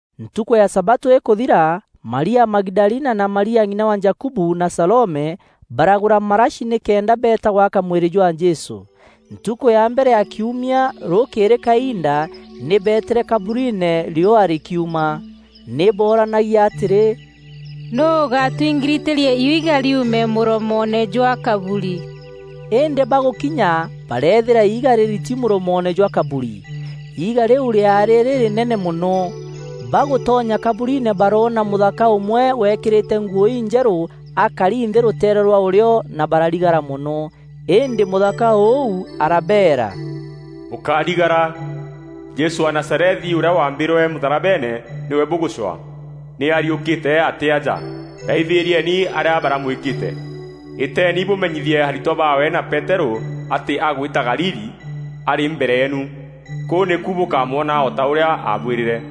Ntukû ya sabatû îkûthira, Maria Magidalina na Maria ng'ina wa Jakubu, na Salome, baragûra marashi nîkenda beeta gwaka mwîrî jwa Jesû. Ntukû ya mbere ya kiumia, rûkîîrî kainda, nî beetîre kaburiine riûa rîkiuma. Nî booranagia atîrî, “Nûû ûgatwingiritîria iiga riume mûromoone jwa kaburi?” Îndî bagûkinya bareethîra iiga rîriti mûromoone jwa kaburi. Iiga rîu rîaarî rîrînene mono. Bagûtonya kaburiine baroona mûthaka ûmwe weekîrîte nguû injerû akari nthî rûteere rwa ûrîo na bararigara mono. Îndî mûthaka ûu arabeera, “Bûkárigara, Jesû wa Nazarethi, ûrîa waambîrwe mûtharabeene nîwe bûgûcwaa. Nî ariûkîre, atî aja. Raithîrieni arîa baramwîkîte. Îteeni bûmenyithie aritwa baawe na Peterû atî: ‘Agwîta Galili arî mbere yeenu. Kûu nîku bûkamwona, o ta ûrîa aabwîrîre.’”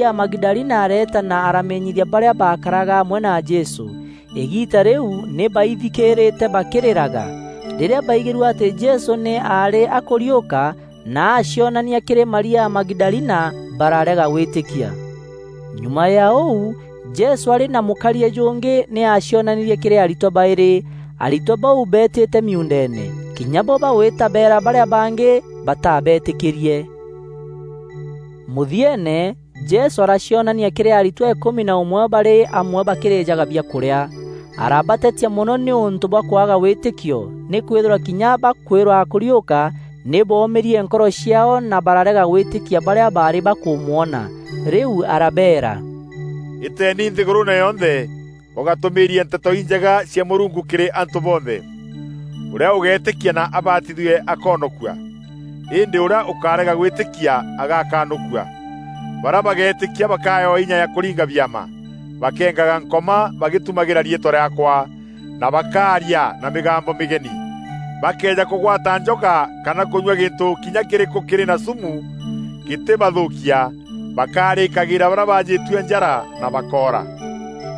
Maria Magidalina areeta na aramenyithia barîa baakaraga amwe na Jesû. Îgiita rîu nî baithikîîrîte bakîrîraga. Rîrîa baigîrue atî Jesû nî aarî akûriûka na acionania kîrî Maria Magidalina, bararega gwîtîkia. Nyuma ya ûu, Jesû arî na mûkariî jûngî nî aacionanîrie kîrî aritwa baîrî. Aritwa bau beetîte miuundeene. Kinya bo bagwîta beera barîa bangî, batabeetîkîrie. Mûthieene, Jesû aracionania kîrî aritwa îkûmi na ûmwe barî amwe bakîrîjaga biakûrîa. Arabatetia mono nîûntû bwa kwaga wîtîkio nîkwîthîrwa kinya bakwîrwa akûriûka nî boomîrie nkoro ciaao na bararega gwîtîkia barîa baarî bakûmwona. Rîu arabeera, “Îteeni nthîgûrûûne yonthe bûgatûmîîrie Nteto Injega cia Mûrungu kîrî antû bonthe. Ûrîa ûgeetîkia na abatithue akoonokua. Îndî ûrîa ûkarega gwîtîkia agaakanûkua. Barîa bageetîkia bakaewa inya ya kûringa biama: bakeengaga Nkoma bagîtumagîra riîtwa rîaakwa, na bakaaria na mîgambo mîgeni, bakëeja kûgwata njoka kana kûnyua gîntû kinya kîrîkû kîrî na sûmu, gîtîbathûkia. Bakarîkagîîra barîa baajîtue njara na bakoora.”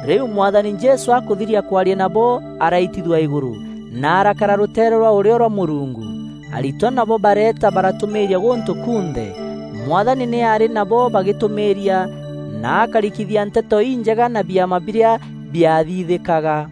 Rîu Mwathani Jesû akûthiria kwaria nabo, araitithua îgûrû, na arakara rûteere rwa ûrîo rwa Mûrungu. Aritwa nabo bareeta baratûmîîria gûntû kunthe. Mwathani nî aarî nabo bagîtûmîîria na akarikîthia Nteto Injega na biama birîa biathithîkaga.]